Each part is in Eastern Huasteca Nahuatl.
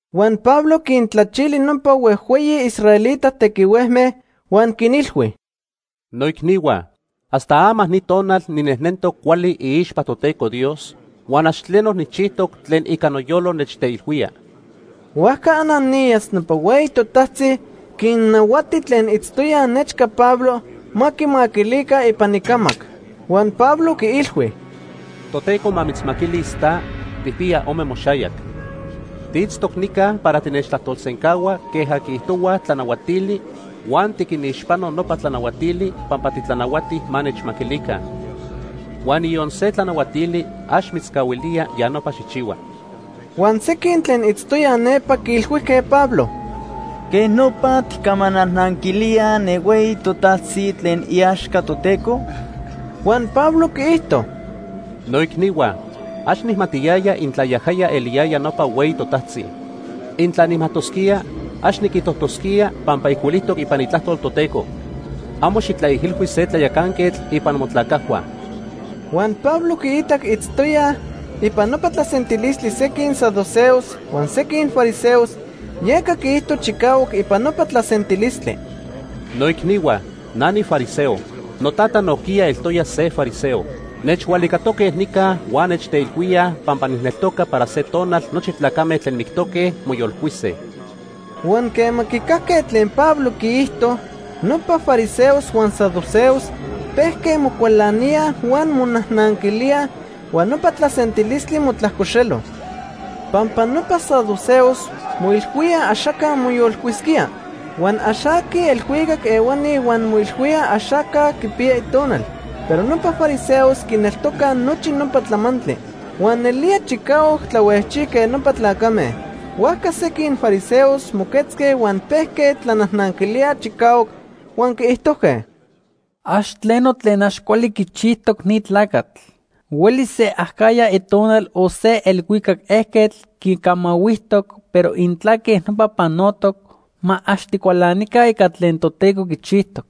Huan Pablo quintlachili nopa huejhueyi israelita tequihuejme huan quinilhui: ―¡Noicnihua! Hasta ama ni tonal ninejnentoc cuali iixpa Toteco Dios huan ax tleno nijchijtoc tlen ica noyolo nechteilhuía. Huajca Ananías, nopa hueyi totajtzi quinnahuati tlen itztoya nechca Pablo ma quimaquilica ipan icamac. Huan Pablo quiilhui: ―Toteco ma mitzmaquilis ta, tijpiya ome moxayac. Tiitztoc nica para tinechtlajtolsencahua queja quiijtohuaj tlanahuatili huan tiquinixpano nopa tlanahuatili pampa titlanahuati ma nechmaquilica. Huan niyon se tlanahuatili ax mitzcahuilía ya nopa xijchihua. Huan sequin tlen itztoyaj nepa quiilhuijque Pablo: ―¿Quej nopa tijcamanajnanquilía ne hueyi totajtzi tlen iaxca Toteco? Huan Pablo quiijto: ―Noicnihua, ax nijmatiyaya intla yajaya eliyaya nopa hueyi totajtzi. Intla nijmajtosquía, ax niquijtojtosquía pampa ijcuilijtoc ipan Itlajtol Toteco: ‘Amo xijtlaijilhui se tlayacanquetl ipan motlacajhua.’ Huan Pablo quiitac itztoyaj ipan nopa tlasentilistli sequin saduceos huan sequin fariseos, yeca quiijto chicahuac ipan nopa tlasentilistli: ―Noicnihua, na nifariseo. Notata nojquiya eltoya se fariseo. Nechhualicatoque nica huan nechteilhuíaj pampa nijneltoca para se tonal nochi tlacame tlen mictoque, moyolcuise. Huan quema quicajque tlen Pablo quiijto, nopa fariseos huan saduceos pejque mocualaníaj huan monajnanquilíaj, huan nopa tlasentilistli motlajcoxelo. Pampa nopa saduceos moilhuíaj axaca moyolcuisquía, huan ax aquij elhuicac ehuani huan moilhuíaj axaca quipiya itonal. Pero nopa fariseos quineltocaj nochi nopa tlamantli. Huan nelía chicahuac tlahuejchijque nopa tlacame. Huajca sequin fariseos moquetzque huan pejque tlanajnanquilíaj chicahuac, huan quiijtojque: ―Ax tleno tlen ax cuali quichijtoc ni tlacatl. Huelis se acajya itonal o se elhuicac ejquetl quicamahuijtoc, pero intla queja nopa panotoc, ma ax ticualanica ica tlen Toteco quichijtoc.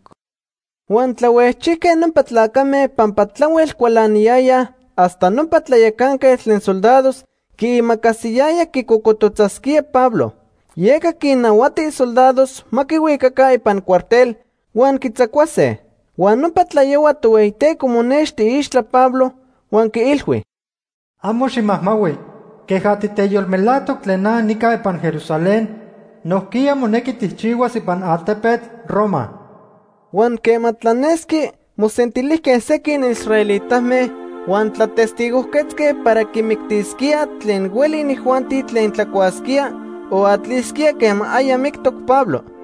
Huan tlahuejchijque nopa tlacame pampa tlahuel cualaniyayaj hasta nopa tlayacanquetl tlen soldados quiimacasiyaya quicocototzasquíaj Pablo. Yeca quinnahuati isoldados ma quihuicaca ipan cuartel huan quitzacuase. Huan nopa tlayohua Tohueyiteco monexti iixtla Pablo huan quiilhui: “Amo ximajmahui. Queja titeyolmelajtoc tlen na nica ipan Jerusalén, nojquiya monequi tijchihuas ipan altepetl Roma.” Huan quema tlanesqui mosentilijque sequin israelitame huan tlatestigojquetzque para quimictisquíaj tlen hueli inijuanti tlen tlacuasquía o atlisquía quema aya mictoc Pablo.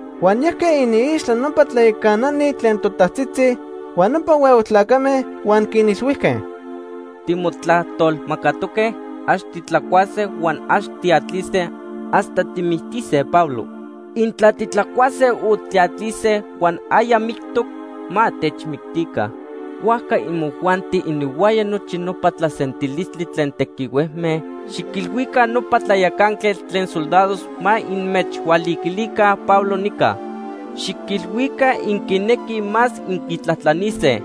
Huan yajque iniixtla nopa tlayacanani tlen totajtzitzi huan nopa huehue tlacame huan quinilhuijque: ―Timotlajtolmacatoque ax titlacuase huan ax tiatlise hasta tijmictise Pablo. Intla titlacuase o tiatlise huan aya mictoc, ma techmictica. Huajca imojuanti ininhuaya nochi nopa tlasentilistli tlen tequihuejme xiquilhuica nopa tlayacanquetl tlen soldados ma inmechhualiquilica Pablo nica. Xiquilhuica inquinequij más inquitlajtlanise.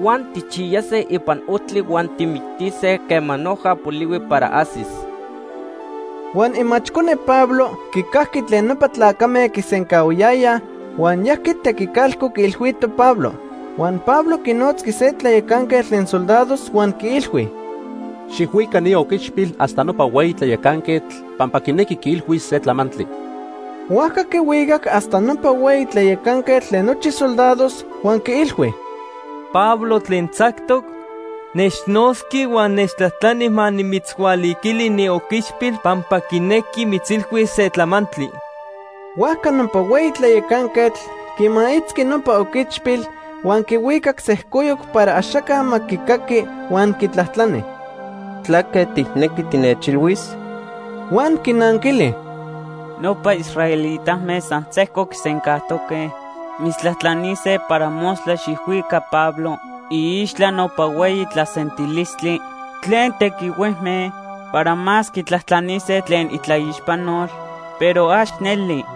Huan tijchiyase ipan ojtli huan tijmictise quema noja polihui para ajsis. Huan imachcone Pablo quicajqui tlen nopa tlacame quisencahuayayaj huan yajqui tequicalco quiilhuito Pablo. Huan Pablo quinotzqui se tlayacanquetl tlen soldados huan quiilhui: ―Xijhuica ni oquichpil hasta nopa hueyi tlayacanquetl pampa quinequi quiilhuis se tlamantli. Huajca quihuicac hasta nopa hueyi tlayacanquetl tlen nochi soldados huan quiilhui: ―Pablo tlen tzactoc, nechnotzqui huan nechtlajtlani ma nimitzhualiquili ni oquichpil pampa quinequi mitzilhuis se tlamantli. Huajca nopa hueyi tlayacanquetl quimaitzqui nopa oquichpil huan quihuicac sejcoyoc para axaca ma quicaqui huan quitlajtlani: ―¿Tlaque tijnequi tinechilhuis? Huan quinanquili: ―Nopa israelitame san sejco quisencajtoque mitztlajtlanise para mostla xijhuica Pablo iixtla nopa hueyi tlasentilistli tlen tequihuejme para más quitlajtlanise tlen itlaixpanol, pero ax neli.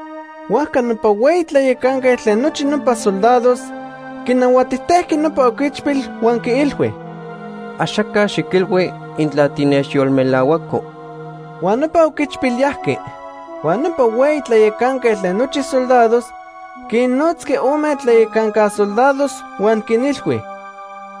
Huajca nopa hueyi tlayacanquetl tlen nochi nopa soldados quinahuatijtejqui nopa oquichpil huan quiilhui: ―Axaca xiquilhui intla tinechyolmelahuaco. Huan nopa oquichpil yajqui. Huan nopa hueyi tlayacanquetl tlen nochi soldados quinnotzqui ome tlayacanca soldados huan quinilhui: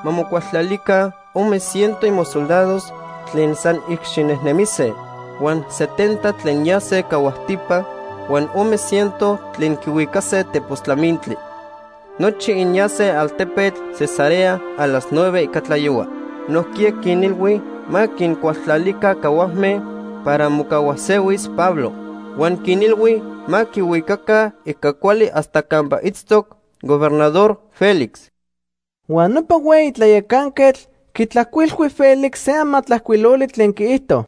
―Ma mocualtlalica ome ciento imosoldados tlen san icxinejnemise, huan setenta tlen yase cahuajtipa huan ome ciento tlen quihuicase tepos tlamintli. Nochi inyase altepetl Cesarea a las nueve ica tlayohua. Nojquiya quinilhui ma quincualtlalica cahuajme para mocahuajsehuis Pablo, huan quinilhui ma quihuicaca ica cuali hasta campa itztoc Gobernador Félix. Huan nopa hueyi tlayacanquetl quitlajcuilhui Félix se amatlajcuiloli tlen quiijto: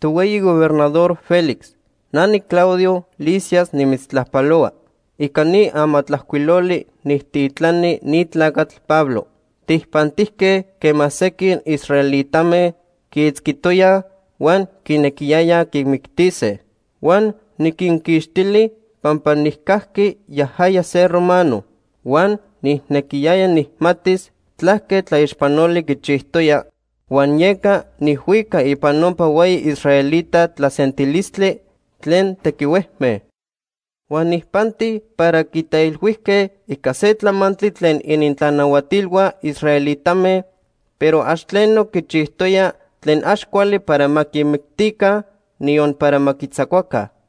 “Tohueyi Gobernador Félix, “na niClaudio Lisias nimitztlajpalohua. “Ica ni amatlajcuiloli nijtitlani ni tlacatl Pablo. Tijpantijque quema sequin israelitame quiitzquitoyaj huan quinequiyayaj quimictise. Huan niquinquixtili pampa nijcajqui yajaya se romano. Huan nijnequiyaya nijmatis tlaque tlaixpanoli quichijtoya huan yeca nijhuicac ipan nopa hueyi israelita tlasentilistli tlen tequihuejme. Huan nijpanti para quiteilhuijque ica se tlamantli tlen inintlanahuatilhua israelitame, pero ax tleno quichijtoya tlen ax cuali para ma quimictica, niyon para ma quitzacuaca.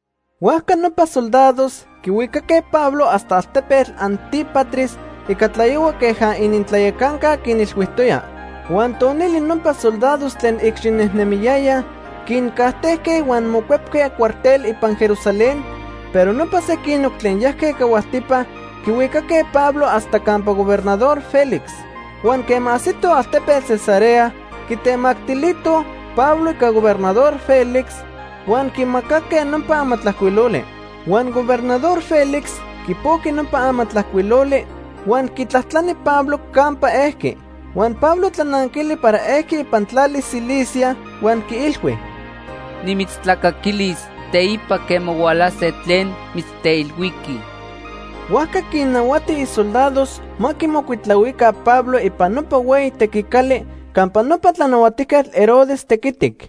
Huajca nopa soldados quihuicaque Pablo hasta altepetl Antípatris ica tlayohua queja inintlayacanca quinilhuijtoya. Huan tonili nopa soldados tlen icxinejnemiyayaj quincajtejque huan mocuepque cuartel ipan Jerusalén, pero nopa sequinoc tlen yajque cahuajtipa quihuicaque Pablo hasta campa Gobernador Félix. Huan quema ajsitoj altepetl Cesarea, quitemactilitoj Pablo ica Gobernador Félix, huan quimacaque nopa amatlajcuiloli. Huan Gobernador Félix quipojqui nopa amatlajcuiloli huan quitlajtlani Pablo campa ejqui. Huan Pablo tlananquili para ejqui ipan tlali Cilicia, huan quiilhui: ―Nimitztlacaquilis teipa quema hualase tlen mitzteilhuiquij. Huajca quinnahuati isoldados ma quimocuitlahuica Pablo ipan nopa hueyi tequicali campa nopa Tlanahuatijquetl Herodes tequitic.